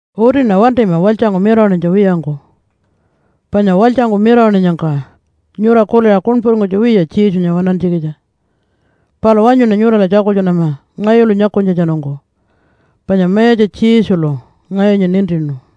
Utiṉa wantima walytjangku mirawaṉinytja wiyangku, panya walytjangku mirawaṉinyangka nyura kuliṟa kuṉpuringkunytja wiya Jesunya waṉantjikitja. Palu wanyuṉa nyurala tjakultjunama ngayulu nyakunytjatjanungku, panya Mayatja Jesulu ngayunya nintinu.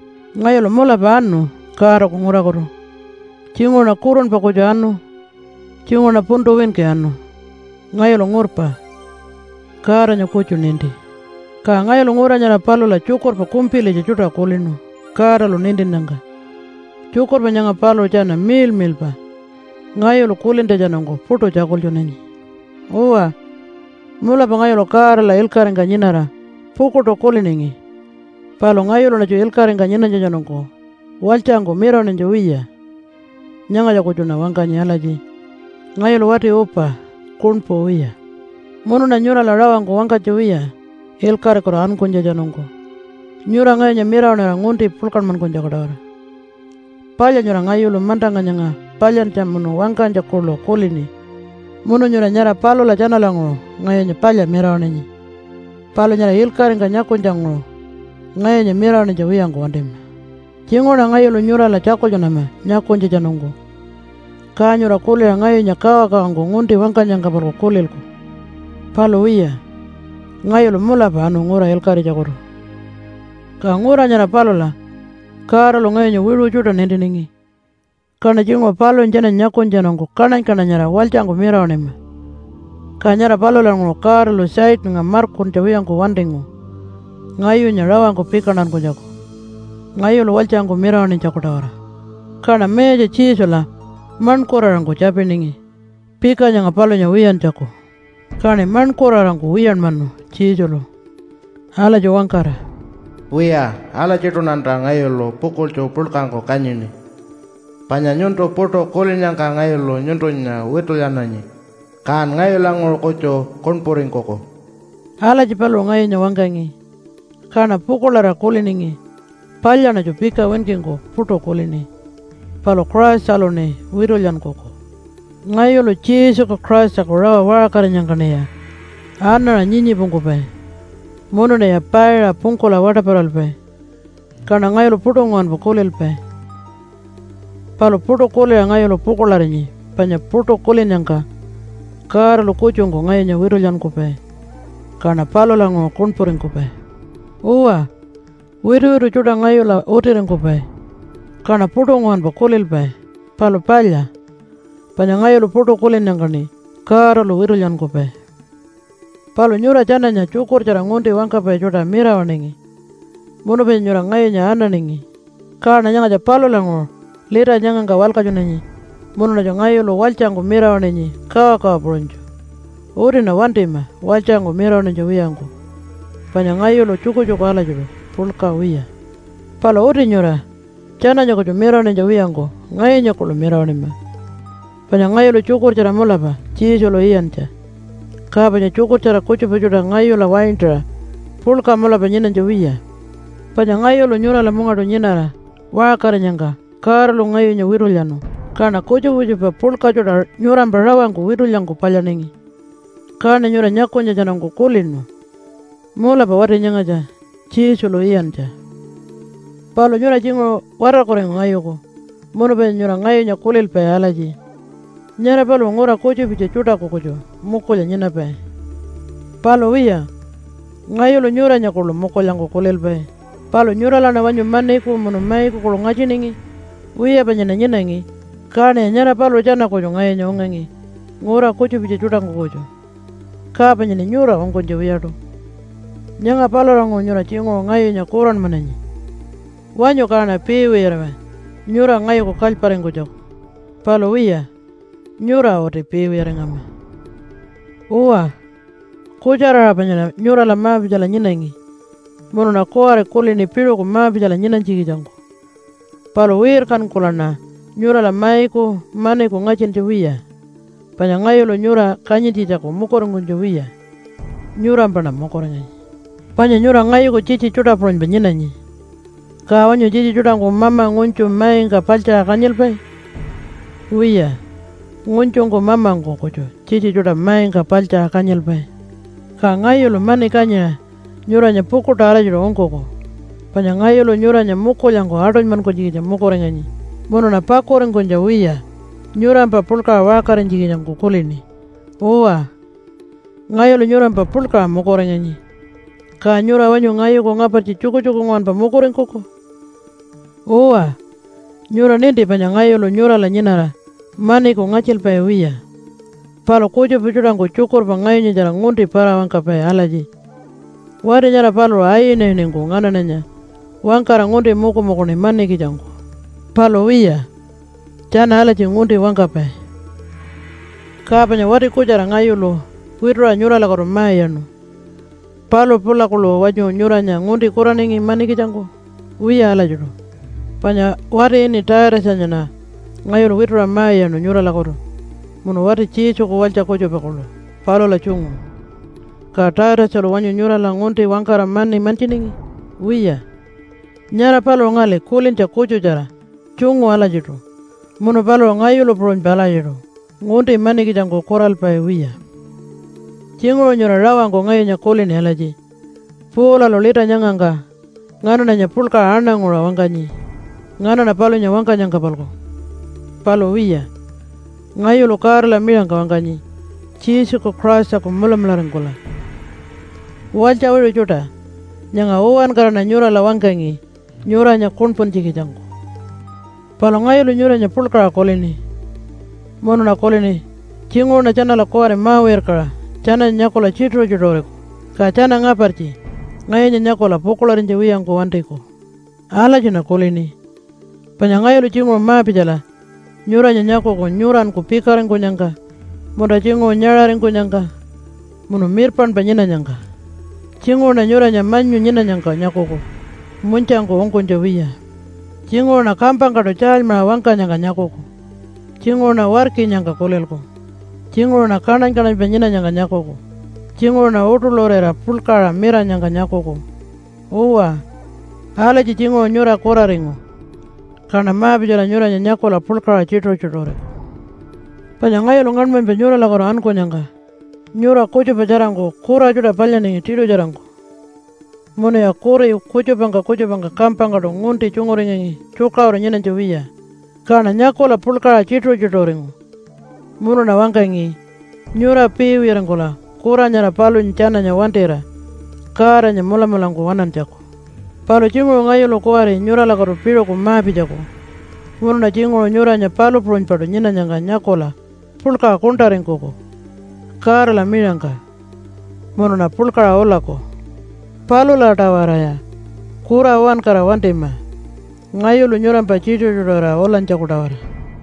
Ngayulu mulapa anu Godaku ngurakutu. Tjinguṟuṉa kurunpa kutju anu, tjinguṟuṉa puntu winki anu. Ngayulu ngurpa. Godanya kutju ninti. Ka ngayulu ngura nyara palula tjukurpa kumpilitja tjuṯa kulinu Godalu nintinnyangka. Tjukurpa nyanga paluṟu tjana miḻmiḻpa ngayulu kulintjatjanungku puṯu tjakultjunanyi. Uwa, mulapa ngayulu Godala ilkaṟingka nyinara pukuḻṯu kuliningi, palu ngayuluṉatju ilkaṟingka nyinanytjatjanungku walytjangku mirawaṉinytja wiya. Nyangatja kutjuṉa wangkanyi alatji, “Ngayulu wati upa, kuṉpu wiya.” Munuṉa nyurala rawangku wangkanytja wiya ilkaṟikutu ankunytjatjanungku nyura ngayunya mirawaṉira ngunti puḻkanmankunytjaku-tawara. Palya nyura ngayulu mantangka nyanga palyantja munu wangkanytja kuḻu kulini munu nyura nyara palula tjanalanguṟu ngayunya palya mirawaṉinyi, palu nyara ilkaṟingka nyakunytjanguṟu ngayunya mirawaṉinytja wiyangku wantima. Tjinguṟuṉa ngayulu nyurala tjakultjunama nyakunytjatjanungku, ka nyura kuliṟa ngayunya kawakawangku ngunti wangkanyangka-palku kulilku. Palu wiya, ngayulu mulapa anu ngura ilkaṟitjakutu. Ka ngura nyara palula Godalu ngayunya wiṟu tjuṯa nintiningi, kaṉa tjinguṟu palunya tjananya nyakunytjatjanungku kaṉany-kaṉanyarira walytjangku mirawaṉima. Ka nyara palulanguṟu Godalu Satannga markuntja wiyangku wantingu ngayunya rawangku pikantakunytjaku, ngayulu walytjangku mirawaṉinytjaku-tawara. Kaṉa Mayatja Jesula maṉkuraṟangku tjapiningi pika nyanga palunya wiyantjaku. Kaṉi maṉkuraṟangku wiyanmanu Jesulu alatji wangkara, “Wiya, alatjiṯuṉanta ngayulu pukuḻtju puḻkangku kanyini, panya nyuntu puṯu kulinnyangka ngayulu nyuntunya witulyananyi, kan ngayulanguṟu kutju kuṉpuringkuku.” Alatji paluṟu ngayunya wangkangi, kaṉa pukuḻarira kuliningi, “Palyaṉatju pika winkingku puṯu kulini, palu Christaluṉi witulyankuku.” Ngayulu Jesuku Christaku rawa waṟkarinyangkaṉiya anaṟa nyii-nyiipungkupai munuṉiya paiṟa pungkula waṯaparalpai kaṉa ngayulu puṯu nguwanpa kulilpai. Palu puṯu kuliṟa ngayulu pukuḻarinyi panya puṯu kulinnyangka Godalu kutjungku ngayunya witulyankupai, kaṉa palulanguṟu kuṉpuringkupai. Uwa, wituwitu tjuṯa ngayula utiringkupai kaṉa puṯu nguwanpa kulilpai. Palu palya, panya ngayulu puṯu kulinnyangkaṉi Godalu witulyankupai. Palu nyura tjananya tjukurtjara ngunti wangkapai tjuṯa mirawaṉingi munu panya nyura ngayunya ananingi, kaṉa nyangatja palulanguṟu lita nyangangka walkatjunanyi munuṉatju ngayulu walytjangku mirawaṉinyi kawakawa puṟunytju. Utiṉa wantima walytjangku mirawaṉinytja wiyangku panya ngayulu tjukutjuku alatjiṯu puḻka wiya. Palu uti nyura tjananya kutju mirawaṉinytja wiyangku ngayunya kuḻu mirawaṉima, panya ngayulu tjukurtjara mulapa Jesulu iyantja, ka panya tjukurtjara kutjupa tjuṯa ngayula waintaṟa puḻka mulapa nyinanytja wiya. Panya ngayulu nyurala mungaṯu nyinara waṟkarinyangka Godalu ngayunya witulyanu, kaṉa kutjupa kutjupa puḻka tjuṯa nyurampa rawangku witulyangku palyaningi, kaṉi nyura nyakunytjatjanungku kulinu, “Mulapa wati nyangatja Jesulu iyantja.” Palu nyura tjinguṟu watarkuringu ngayuku munu panya nyura ngayunya kulilpai alatji, “Nyara paluṟu ngura kutjupitja tjuṯaku kutju mukulya nyinapai.” Palu wiya, ngayulu nyuranya kuḻu mukulyangku kulilpai. Palu nyuralaṉa wanyu maniku munu maiku kuḻu ngatjiningi? Wiya, panyaṉa nyinangi kaṉiya nyara paluṟu tjana kutju ngayunya ungangi ngura kutjupitja tjuṯangku kutju, ka panyaṉi nyura ungkunytja wiyaṯu. Nyanga palulanguṟu nyura tjinguṟu ngayunya kuranmananyi. Wanyu kaṉa piiwiyariwa nyura ngayuku kalyparingkunytjaku! Palu wiya, nyura uti piiwiyaringama. Uwa, kutjara-aṟa panyaṉa nyurala ma-pitjala nyinangi, munuṉa kuwari kulini piṟuku ma-pitjala nyinanytjikitjangku. Palu wirkankulaṉa nyurala maiku maniku ngatjintja wiya, panya ngayulu nyura kanyintjitjaku mukuringkunytja wiya, nyurampaṉa mukuringanyi. Panya nyura ngayuku tjitji tjuṯa puṟunypa nyinanyi, ka wanyu tjitji tjuṯangku mama ngunytju maingka paḻtjaṟa kanyilpai? Wiya, ngunytjungku mamangku kutju tjitji tjuṯa maingka paḻtjaṟa kanyilpai. Ka ngayulu mani kanyiṟa nyuranya pukuḻṯu alatjiṯu ungkuku, panya ngayulu nyuranya mukulyangku aṯunymankunytjikitja mukuringanyi munuṉa pakuringkunytja wiya nyurampa puḻkaṟa waṟkarinytjikitjangku kulini. Uwa, ngayulu nyurampa puḻkaṟa mukuringanyi. Ka nyura wanyu ngayuku ngapartji tjukutjuku nguwanpa mukuringkuku? Uwa, nyura ninti panya ngayulu nyurala nyinara maniku ngatjilpai wiya. Palu kutjupa tjuṯangku tjukurpa ngayunyatjara ngunti para-wangkapai alatji, “Wati nyara paluṟu ayinayiningku nganaṉanya wangkara ngunti mukumukuningi manikitjangku.” Palu wiya, tjana alatji ngunti wangkapai. Ka panya wati kutjara ngayulu wituṟa nyuralakutu ma-iyaṉu, paluṟu pula kuḻu wanyu nyuranya ngunti kuraningi manikitjangku? Wiya alatjiṯu. Panya wati ini Taitatjanyaṉa ngayulu wituṟa ma-iyaṉu nyuralakutu munu wati Jesuku walytja kutjupa kuḻu palula tjungu. Ka Taitatjalu wanyu nyurala ngunti wangkara mani mantjiningi? Wiya. Nyara paluṟu ngali kulintja kutjutjara tjungu alatjiṯu munu paluṟu ngayulu puṟunypa alatjiṯu ngunti manikitjangku kuralpai wiya. Tjinguṟu nyura rawangku ngayunya kulini alatji, “Paulalu lita nyangangka nganaṉanya puḻkaṟa aṉanguṟa wangkanyi nganaṉa palunya wangkanyangka-palku.” Palu wiya, ngayulu Godala miṟangka wangkanyi Jesuku Christaku mulamularingkula. Walytja wiṟu tjuṯa! Nyanga uwankaraṉa nyurala wangkangi nyuranya kuṉpuntjikitjangku. Palu ngayulu nyuranya puḻkaṟa kulini, munuṉa kulini, “Tjinguṟuṉa tjanala kuwari ma-wirkaṟa tjananya nyakula tjituṟu-tjituṟuriku, ka tjana ngapartji ngayunya nyakula pukuḻarinytja wiyangku wantiku.” Alatjiṉa kulini, panya ngayulu tjinguṟu ma-pitjala nyuranya nyakuku nyuranku pikaringkunyangka, munta tjinguṟu nyaṟaringkunyangka munu mirpaṉpa nyinanyangka. Tjinguṟuṉa nyuranya manyu nyinanyangka nyakuku munytjangku ungkunytja wiya. Tjinguṟuṉa kampangkaṯu tjaalymaṟa wangkanyangka nyakuku, tjinguṟuṉa warkinyangka kulilku, tjinguṟuṉa kaṉany-kaṉanypa nyinanyangka nyakuku, tjinguṟuṉa uṯuḻurira puḻkaṟa miranyangka nyakuku. Uwa, alatji tjinguṟu nyura kuraringu, kaṉa ma-pitjala nyuranya nyakula puḻkaṟa tjituṟu-tjituṟuriku. Panya ngayulu ngaṉmanypa nyuralakutu ankunyangka nyura kutjupa tjarangku kura tjuṯa palyaningi tiṯutjarangku, munuya kuri kutjupangka kutjupangka kampangkaṯu ngunti tjunguringangi tjukaṟuru nyinanytja wiya. Kaṉa nyakula puḻkaṟa tjituṟu-tjituṟuringu munuṉa wangkangi nyura piiwiyaringkula kura nyara palunya tjananya wantira Godanya mulamulangku waṉantjaku. Palu tjinguṟu ngayulu kuwari nyuralakutu piṟuku ma-pitjaku munuṉa tjinguṟu nyuranya palu puṟunypaṯu nyinanyangka nyakula puḻkaṟa kuṉṯaringkuku Godala miṟangka munuṉa puḻkaṟa ulaku. Palula-tawaraya kura uwankara wantima ngayulu nyurampa tjituṟu-tjituṟurira ulanytjaku-tawara.